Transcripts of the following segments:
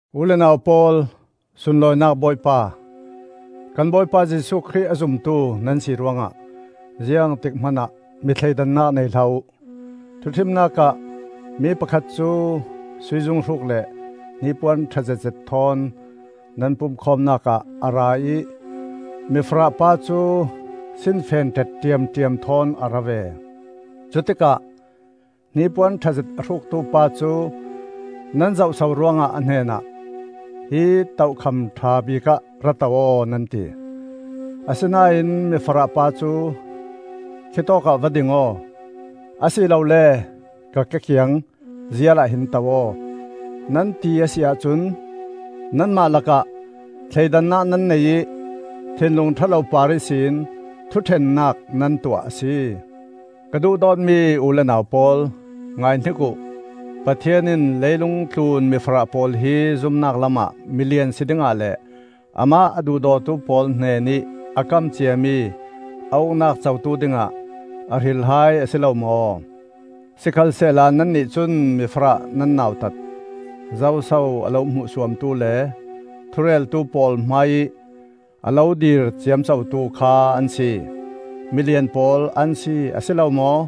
U le nau pawl, sunlawinak Bawipa, kan Bawipa Jesuh Khrih a zumtu nan si ruangah ziangtik hmanah mi thleidannak nei hlah uh. Thuṭhimnak ah mi pakhat cu sui zunghruk le hnipuan ṭha zetzet thawn nan pumkhawmnak ah a ra ih mifarah pa cu sinfen ṭet ṭiamṭiam thawn a ra ve. Cutikah hnipuan ṭhazet a hruktu pa cu nan zohso ruangah a hnenah, “Hi tokham ṭha bikah ra to aw,” nan ti; asinain mifarah pa cu, “Khi tawkah va ding aw; asilole ka ke kiang zial ahhin to aw,” nan ti a si ahcun, nanmah lakah thleidannak nan nei ih thinlung ṭha lo par ihsin thuṭhennak nan tuah a si. Ka duhdawtmi u le nau pawl, ngaihnik uh. Pathian in leilung tlun mifarah pawl hi zumnak lamah milian si dingah le amah a duhdawtu pawl hnenih a kam ciami a Uknak cotu dingah a hril hai a si lo maw? Sikhalsehla nannih cun mifarah nan nautat. Zoso a lo hmuhsuamtu le thureltu pawl hmaiih a lo dir ciamcotu kha an si? Milian pawl an si, a si lo maw?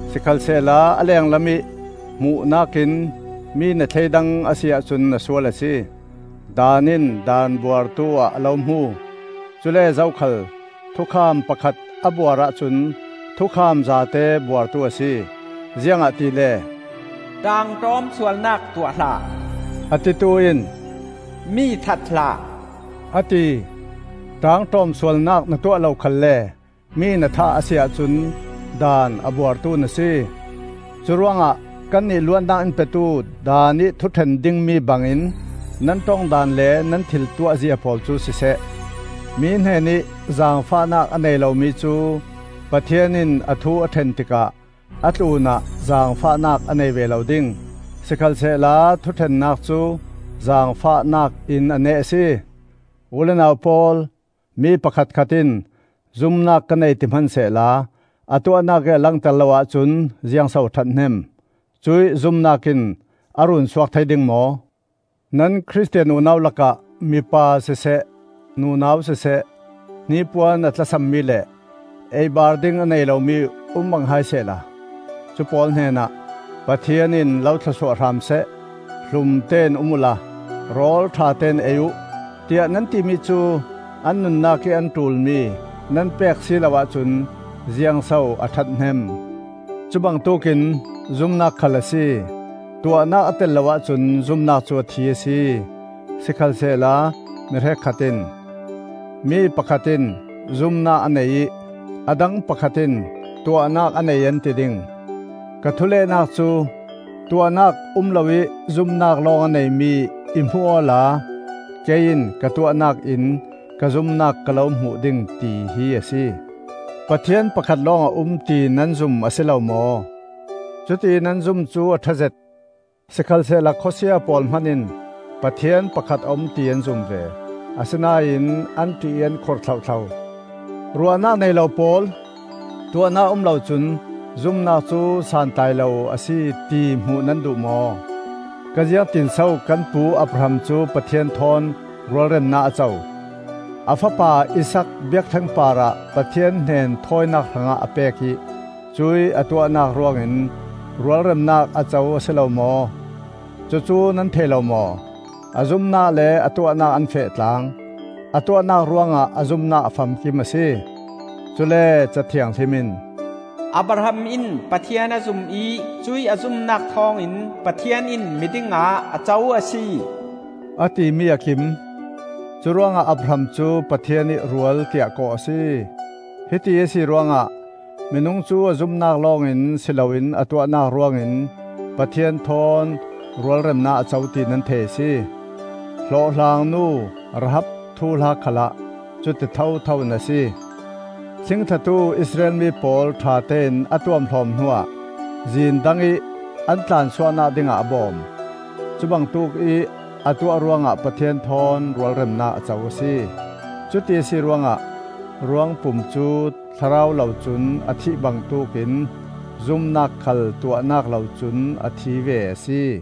Sikhalsehla a lenglamih hmuhnak in mi na thleidang a si ahcun na sual a si. Daan in daan buartu-ah a lo hmu. Cule zokhal thukham pakhat a buar ahcun thukham zate buartu a si. Ziangahtile, “ṭaangṭawm sualnak tuah hlah,” a titu in, “Mi that hlah,” a ti. Ṭaangṭawm sualnak na tuah lo khalle mi na thah a si ahcun daan a buartu na si. Curuangah kannih luatnak in petu daanih thuṭhen dingmi bangin nan ṭong daan le nan thil tuahzia pawl cu siseh. Mi hnenih zaangfahnak a nei lomi cu Pathian in a thu a ṭhen tikah a tlunah zaangfahnak a nei ve lo ding; sikhalsehla thuṭhennak cu zaangfahnak in a neh a si. U le nau pawl, mi pakhatkhat in zumnak ka nei ti hmansehla a tuahnak ih a langter lo ahcun ziangso a ṭhathnem? Cuih zumnak in a runsuak thei ding maw? Nan Khristian unau lakah mipa siseh nunau siseh hnipuan a tlasammi le ei-bar ding a nei lomi um bang hai sehla, cu pawl hnenah, “Pathian in lo thlawsuah hram seh. Hlumtein um uhla rawl ṭhatein ei uh,” tiah nan timi cu an nunnak ih an ṭulmi nan pek si lo ahcun ziangso a ṭhathnem? Cu bangtuk in zumnak khal a si; tuahnak a tel lo ahcun zumnak cu a thi a si. Sikhalsehla mi hrekkhat in, “Mi pakhat in zumnak a nei ih a dang pakhat in tuahnak a nei,” an ti ding. Ka thulehnak cu, “Tuahnak um loih zumnak lawng a neimi i hmuh awla kei in ka tuahnak in ka zumnak ka lo hmuh ding,” ti hi a si. Pathian pakhat lawng a um, ti nan zum a si lo maw? Cuti nan zum cu a ṭhazet. Sikhalsehla khawsia pawl hman in Pathian pakhat a um ti an zum ve; asinain an ṭih ih an khur thlohthlo. Ruahnak nei lo pawl! Tuahnak um lo cun zumnak cu santlai lo a si, ti hmuh nan duh maw? Ziangtin so kan pu Abraham cu Pathian thawn rualremnak a co? A fapa Isaak biakṭheng parah Pathian hnen thawinak hrangah a pek ih cuih a tuahnak ruangin rualremnak a co a si lo maw? Cucu nan thei lo maw? A zumnak le a tuahnak an feh tlaang. A tuahnak ruangah a zumnak a famkim a si. Cule Ca Thianghlim in, “Abraham in Pathian a zum ih cuih a zumnak thawngin Pathian in miding ah a co a si,” a timi a kim. Curuangah Abraham cu, “Pathian ih rual,” tiah kawh a si. Hiti a si ruangah minung cu a zumnak lawngin si loin a tuahnak ruangin Pathian thawn rualremnak a co ti nan thei a si. Hlawhhlang nu Rahab thuhla khalah cuti thothoin a si. Thlingthlatu Israel mi pawl ṭhatein a tuamhlawm hnuah zin dangih an tlansuahnak dingah a bawm; cu bangtuk ih a tuah ruangah Pathian thawn rualremnak a co a si. Cuti a si ruangah ruangpum cu thlarau lo cun a thih bangtuk in zumnak khal tuahnak lo cun a thi ve a si.